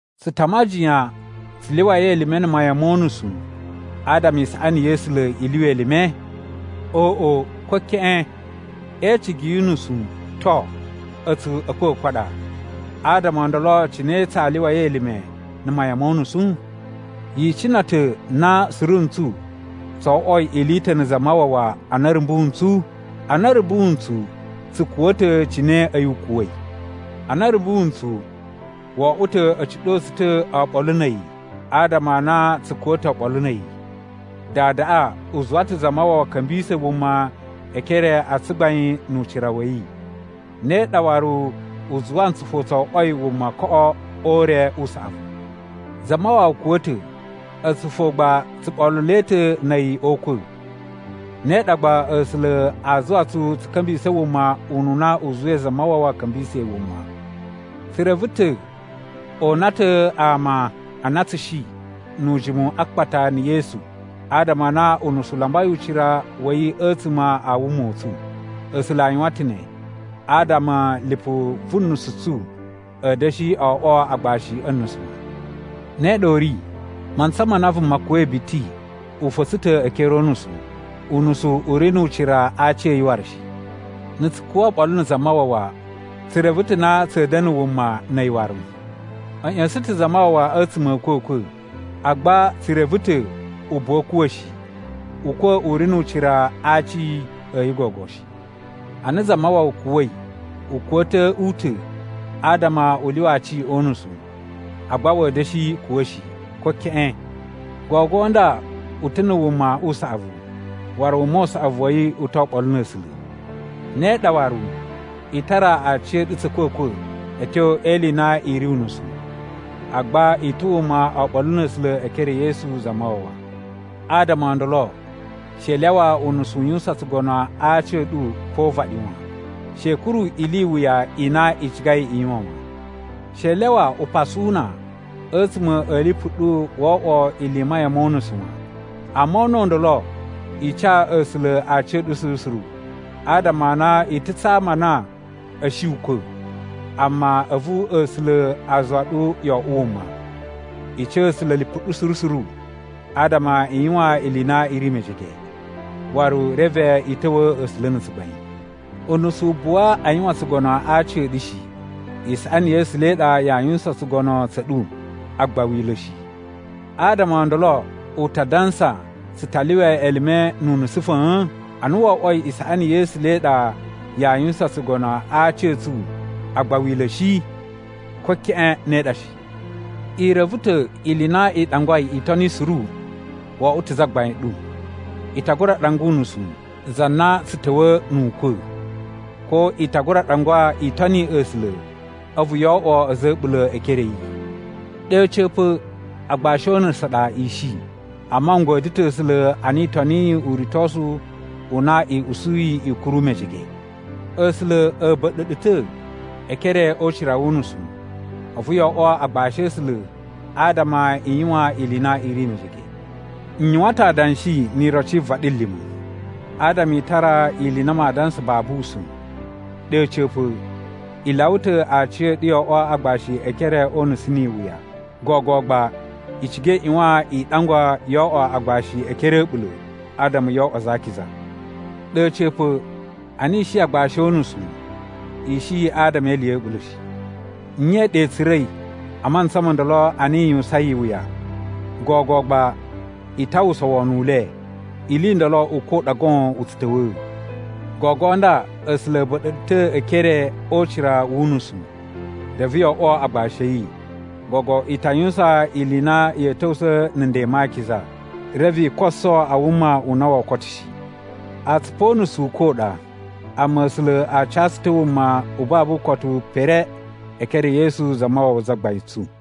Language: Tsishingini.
Tsu ta majiyan tsu lyuwai elime na̱ mayan mo unusu adama isaꞌani ya̱ A̱sula̱ i lyuwa elime? Oꞌo, ko keꞌen! E icigi yu unusu, to, a̱tsu a̱kwa̱kwa̱ a ɗa, adama o ndolo cine tsaa lyuwai elime na̱ mayan mo unusu? Yi icina ta̱ na suru ntsu tso oꞌwoi ili i ta̱ na̱ Zamawawa ana a̱ rumbu ntsu? Ana a̱ rumbu ntsu, tsu kuwa̱ ta̱ cine a̱yi u kuwa̱i. Ana a̱ rumbu ntsu, wo oꞌwo ta̱ a̱ ciɗo tsu ta̱ oɓolo na̱ a̱yi adama a na tsu kuwa̱ ta̱ oɓolo na̱ a̱yi. Dadaꞌa u zuwa ta̱ Zamawawa ka̱mbisa̱ wuma e ekere a tsugbain nu ucira wa̱ yi. Ne ɗa waru, u zuwa ntsu fo tso oꞌwoi wuma koꞌo o ure u saꞌavu. Zamawawa kuwa̱ ta̱, a̱tsu fo gba tsu ɓoluloi ta̱ na̱ a̱yi o ukwa̱. Ne ɗa gba A̱sula̱ aa zuwa tsu tsu ka̱mbisa̱ wuma ununa u zuwai Zamawawa ka̱mbisa̱i wuma. Tsu reve ta̱ o una ta̱ ama a na tsu shi nu ujimu a akpata na̱ Yesu adama a na unusu u lambai ucira wa̱ yi a̱tsuma̱ a wuma u tsu. A̱sula̱ a yuwan ta̱ ne adama lipu vu nusu tsu a̱ da̱shi oꞌwo agbashi o unusu wan. Ne ɗa u ri, mantsa ma na vuma kuwa̱i biti u fa̱tsa̱ ta̱ e ekere o unusu, unusu u ri nu ucira a aci a̱ yi waru shi. Na̱ tsu kuwa̱ oɓolo na̱ Zamawawa, tsu reve ta̱ na tsa̱a̱ da̱na̱ wuma na̱ a̱yi waru. A̱ ꞌya̱sa̱n ta̱ Zamawawa a̱tsuma̱ a̱ a̱kwa̱kwa̱, agba tsu reve ta̱ u buwa a̱ kuwa̱ shi. Ukwa̱ u ri nu ucira a aci a̱ yi gogo shi. Ana Zamawawa kuwa̱i, u kuwa̱ ta̱ u ta̱ adama u lyuwa aci o unusu, agba wa̱a̱ da̱shi kuwa̱ shi, ko keꞌen. Gogo nda u ta̱ na̱ wuma u saꞌavu, waru wuma u saꞌavu wa̱ yi u to oɓolo na̱ A̱sula̱. Ne ɗa waru, i tara aciya̱ɗu tsa̱ a̱kwa̱kwa̱ a̱ tyo e ili i na i ri unusu, agba i ta̱ wuma oɓolo na̱ A̱sula̱ e ekere e Yesu Zamawawa. Adama o ndolo she i lyawa unusu u yuwusan tsugono a aci a̱ ɗu pa o uvaɗi wan. She i kuru ili i wuya i na i cigai i yuwan wan. She i lyawa upasu u na a̱tsuma̱ a̱ lipu ɗu wo oꞌwo ili i mayan mo unusu wan. Amma o una̱ u ndolo, i ca A̱sula̱ aciya̱ɗu suru suru adama a na i ta̱ tsa ama a na a̱ shi ukwa̱, amma a̱vu A̱sula̱ a zuwa ɗu yo oꞌwo wuma. I ca A̱sula̱ lipu ɗu suru suru adama i yuwan ili i na i ri mejege, waru reve i ta̱wa̱a̱ A̱sula̱ na̱ tsugbain. Unusu u buwa a yuwan tsugono a aci a̱ ɗu shi. Isaꞌani ya̱ A̱sula̱ i ɗa yaa yuwusan tsugono tsa̱ ɗu, agba Wila̱ shi. Adama o ndolo, u ta dansa tsu ta lyuwa elime nu unusu fa̱a̱n, ana wo oꞌwoi isaꞌani ya̱ A̱sula̱ i ɗa yaa yuwusan tsugono a aci a̱ tsu, agba Wila̱ shi? Ko keꞌen, ne ɗa shi! I reve ta̱ ili i na i ɗangwai i toni suru wo oꞌwo ta̱ zagbain ɗu. I ta gura ɗangwa unusu, za na tsu ta̱wa̱a̱ nu ukwa̱, ko i ta gura ɗangwa i toni A̱sula̱, a̱vu yo oꞌwo a̱za̱ a̱ a̱ɓula̱ e ekere a̱ yi. Ɗe a̱ca̱pa̱, agbashi o unusu a ɗa i shi. Amma n godyo ta̱ A̱sula̱ a na i toniyi uritosu u na i usuyi i kuru mejege. A̱sula̱ a̱ ba̱ɗa̱ ɗu ta̱ e ekere o ucira wu unusu, a̱vu yo oꞌwo agbashi a̱ A̱sula̱ adama i yuwan ili i na i ri mejege. N yuwan ta̱ adanshi ni iroci yi vaɗilima̱ adama i tara ili i na maa dansa babu usa̱n. Ɗe a̱ca̱pa̱, i lyawa ta̱ aciya̱ɗu yo oꞌwo agbashi e ekere o unusu ni iwuya. Gogo gba i ciga i ꞌyuwan i ɗangwa yo oꞌwo agbashi e ekere a̱ a̱ɓula̱ adama yo oꞌwo aza a akiza. Ɗe a̱ca̱pa̱, ana i shi agbashi o unusu, i shi adama e ili ya̱ a̱ɓula̱ shi. Nye i ɗa i tsura̱i a mantsa mo ndolo a na i yuwusain iwuya? Gogo gba i ta uwwusa wono u le. Ili i ndolo ukwa̱ u ɗa goon u tsu ta̱wa̱a̱. Gogo nda A̱sula̱ a̱ ba̱ɗa̱ ɗu ta̱ e ekere o ucira wu unusu, reve yo oꞌwo agbashi a̱ yi. Gogo i ta yuwusan ili i na ya̱a̱ ta̱wusa̱ na̱ nden ma akiza, reve i koso a wuma u na woo koto shi. Atsupu o unusu ukwa̱ u ɗa, amma A̱sula̱ a ca tsu ta̱ wuma u babu ukotu pere e ekere e Yesu Zamawawa Zagbain tsu.